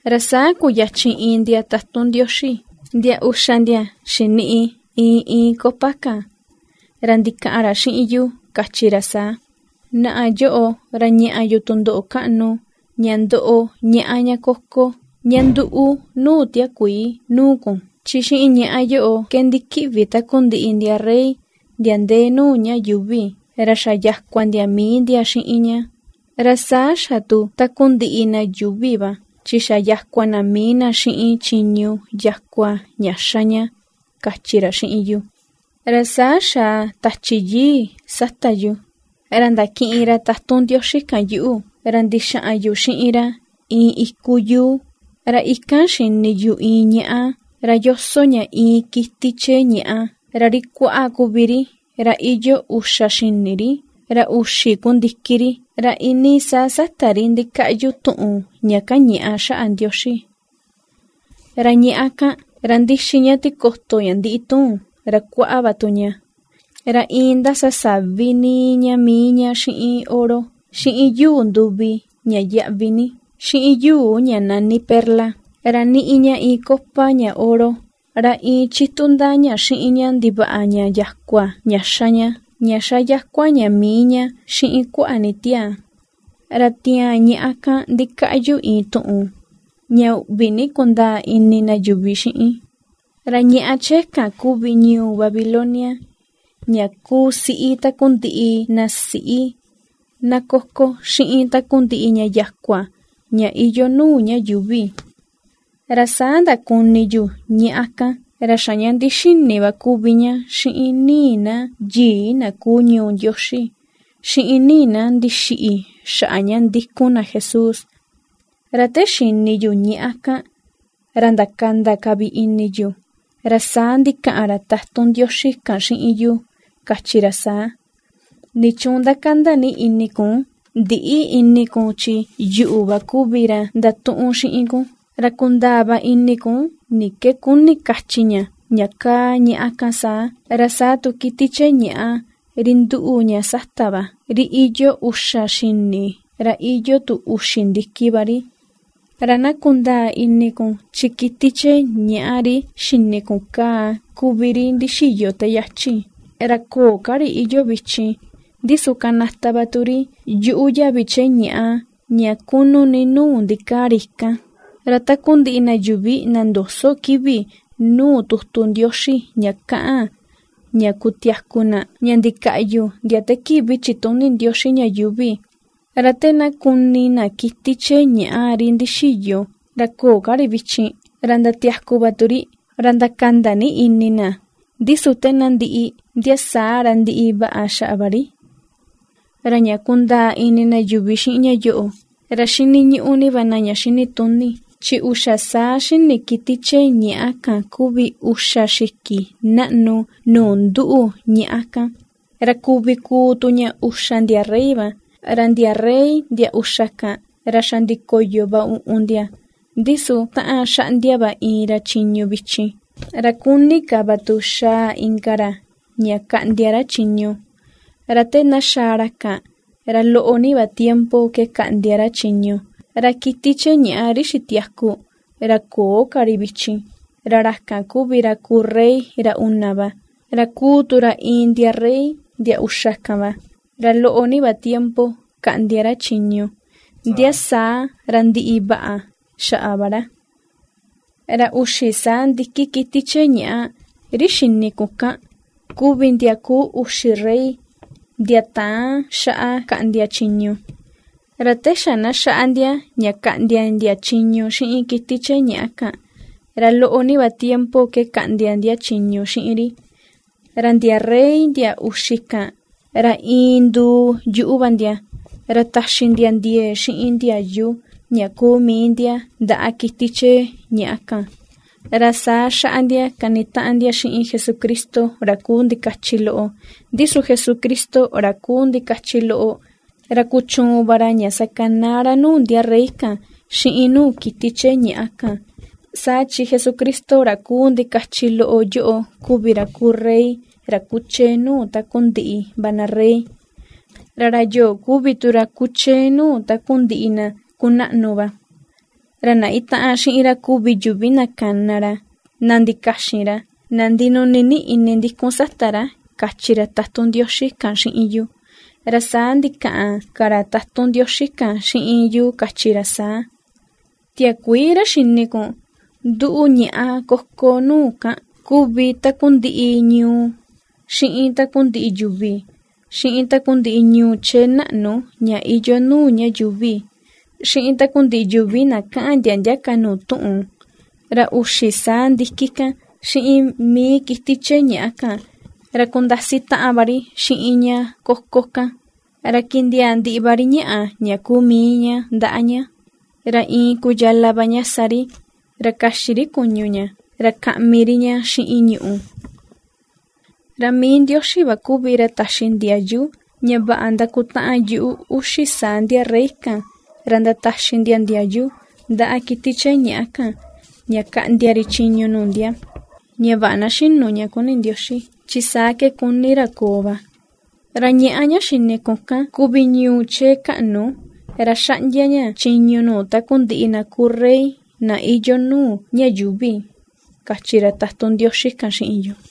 Ra saa kuyachi iin ndia tatun Ndioxi, ndia uxa ndia xiniꞌi iin iin copa kan, ra ndikaꞌan ra xiꞌin yu kachi ra saa: ―Naꞌa yoꞌo ra ña̱ꞌa̱ yu tundoꞌo kaꞌnu, ña ndoꞌo ñaꞌá ña koko, ña ^nduu nuu tiakuii, nuu kun. Chi xiꞌin ñaꞌá yoꞌo ke ndikiꞌvi takundiꞌi ndia rey ndia ndee nuu ña yuuvi, ra xa yakua ndia mii ndia xiꞌin ña, ra saa xa tu takundiꞌi na yuuvi va, chi xa yakua na mii na xiꞌin chiñu yakua ña ^xa ña ―kachi ra xiꞌin yu. Ra saa xaa Tachi Yii sata yu, ra ndakiꞌin ra tatun Ndioxi kan yuꞌu, ra ndixaꞌan yu xiꞌin ra iin iku yuu, ra ikan xini yu iin ñaꞌá, ra yoso ña iin kiti chee ñàꞌa, ra ri kuáꞌá kuvi ri, ra iyoo uxa xini ri, ra uxi ku ndiki ri, ra iinii saa sata ri ndikaꞌyu tuꞌun ña kañaꞌa xaꞌa Ndioxi. Ra ñaꞌá kan, ra ^ndixi ña tikoto ña ndíꞌi tuun, ra kuáꞌá va tu ña, ra iin ^ndasa savi níí ña mii ña xiꞌin oro, xiꞌin yuu nduvi ña yaꞌvi ni, xiꞌin yuu ña nani perla, ra ^niꞌi ña iin copa ña oro, ra iin ^chitu ndaa ña xiꞌin ña ndivaꞌa ña yakua ña xa ña, ña ^xa yakua ña mii ña xiꞌin kuaꞌa ni tiaa. Ra tiaan ñaꞌá kan ndikaꞌyu iin tuꞌun, ña uꞌvi ni kundaa ini na yuvi xiꞌin: “Ra ñaꞌá chee kan kuvi ñuu Babilonia, ña kuu siꞌi takundiꞌi na siꞌi, na koko xiꞌin takundiꞌi ña yakua, ña iyoo nuu ña yuuvi.” Ra saa ndakuni yu ñaꞌá kan, ra xa ña ndixini va kuvi ña xiꞌin ni̱i̱ na yii na kuu ñuu Ndioxi, xiꞌin ni̱i̱ na ndixiꞌi xaꞌa ña ndikun na Jesús. Ra te xini yu ñaꞌá kan, ra ndakanda ka vi ini yu. Ra saa ndikaꞌan ra tatun Ndioxi kan xiꞌin yu kachi ra saa: ―¿Nichuun ^ndakanda ni ini kun? Ndïꞌi ini kun chi yuꞌu va kuvi ra ndatuꞌun xiꞌin kun, ra kundaa va ini kun ni ke kuni kachi ña, ña kaa ñaꞌá kaa saa, ra saa tu kiti chee ñàꞌa ri nduꞌu ña sata va, ri iyoo uxa xini ra iyoo tu uxi ndiki va ri. Ra na kundaa ini kun chi kiti chee ñàꞌa ri xini kun kaa kuvi ri ndixiyo te yachi, ra köo ka ri iyoo vichin; ndi su kanata va tu ri yuꞌu yavi chee ñàꞌa ña kunu ni nuu ndikaa ri kan. Ra takundiꞌi yuvi na ndöso kivi nuu tutu Ndioxi ña kaꞌan ña kutiaku na, ña ndikaꞌyu ndia te kivi chituni Ndioxi ña yuuvi, ra te na kuni na kiti chee ñàꞌa ri ndixiyo, ra köo ka ri vichin, ra ndatiaku va tu ri, ra ndakanda ni ini na, ndi su te na ndiꞌi, ndia saa ra ndiꞌi vaꞌa xaꞌa va ri. ’Ra ña kundaa ini na yuvi xiꞌin ña yoꞌo, ra xiniñuꞌu ni va na ña xinituni: Chi uxa saa xini kiti chee ñàꞌa kan kuvi uxa xiki naꞌnu nuu nduꞌu ñaꞌá kan; ra kuvi kuu tu ña uxa ndia rey va. Ra ndia rey ndia uxa kan, ra xa ndikoyo va uꞌun ndia, ndi su taꞌan xaꞌndia va iin ra chiñu vichin, ra kúni̱ ka va tu xaa inka ra ña kaꞌndia ra chiñu, ra te na xaa ra kan, ra loꞌo ni va tiempo ke kaꞌndia ra chiñu. Ra kiti chee ñàꞌa ri xitiaku, ra köo ka ri vichin, ra ra kan kuvi ra kuu rey ra una va, ra kuu tu ra iin ndia rey ndia uxa kan va, ra loꞌo ní va tiempo kaꞌndia ra chiñu, ndia saa ra ndiꞌi vaꞌa xaꞌa va ra. ’Ra uxi saa ndiki kiti chee ñàꞌa, ri xini kun kan, kuvi ndia kuu uxi rey, ndia täꞌan xaꞌa kaꞌndia chiñu, ra te xa na xaꞌa ndia ña kaꞌndia ndia chiñu xiꞌin kiti chee ñaꞌa kan, ra loꞌo ni va tiempo ke kaꞌndia ndia chiñu xiꞌin ri. Ra ndia rey ndia uxi kan, ra iin nduu yuꞌu va ndia, ra taxi ndia ndiee xiꞌin ndiayu ña kuu mii ndia ndaꞌa kiti chee ñàꞌa kan. Ra saa xaꞌa ndia kanitaꞌan ndia xiꞌin Jesucristo ra kuu ndikachi loꞌo; ndi su Jesucristo ra kuu ndikachi loꞌo, ra kuchuun va ra ña sakanaa ra nuu ndia rey kan xiꞌin nuu kiti chee ñàꞌa kan, saa chi Jesucristo ra kuu ndikachi loꞌo yoꞌo kuvi ra kuu rey ra kuchee nuu takundiꞌi va na rey, ra ra yoꞌo kuvi tu ra kuchee nuu takundiꞌi na kunaꞌnu va. Ra na itaꞌan xiꞌin ra kuvi yuvi na kana ra, na ndikaxin ra, na ndinuni ni ini ndikun sata ra ―kachi ra tatun Ndioxi kan xiꞌin yu. Ra saa ndikaꞌan ka ra tatun Ndioxi kan xiꞌin yu kachi ra saa: ―Tiakuii ra xini kun, nduꞌu ñaꞌá koko nuu kan, kuvi takundiꞌi ñuu, xiꞌin takundiꞌi yuvi, xiꞌin takundiꞌi ñuu chee naꞌnu ña iyoo nuu ña yuuvi, xiꞌin takundiꞌi yuvi na kaꞌan ndia ndia ka nuu tuꞌun. Ra uxi saa ndiki kan xiꞌin mii kiti chee ñàꞌa kan, ra kundasi taꞌan va ri xiꞌin ña koko kan, ra kindiaa ndiꞌi va ri ñàꞌà ña kuu mii ña ndaꞌa ña, ra iin ku yala va ña sa ri; ra kaxi ri kuñu ña, ra kaꞌmi ri ña xiꞌin ñùꞌù. Ra mii Ndioxi va kuvi ra taxi ndiayu, ña vaꞌa ndakutaꞌan yuꞌu uxi saa ndia rey kan ra ndataxi ndia ndiayu ndaꞌa kiti chee ñàꞌa kan ña kaꞌndia ri chiñu nuu ndia, ña vaꞌa na xínu nuu ña kuni Ndioxi, chi saa ke kuni ra koo va. Ra ñaꞌá ña xini kun kan kuvi ñuu chee kaꞌnu, ra ^xaꞌndia ña chiñu nuu takundiꞌi na kuu rey na iyoo nuu ña yuuvi ―kachi ra tatun Ndioxi kan xiꞌin yu.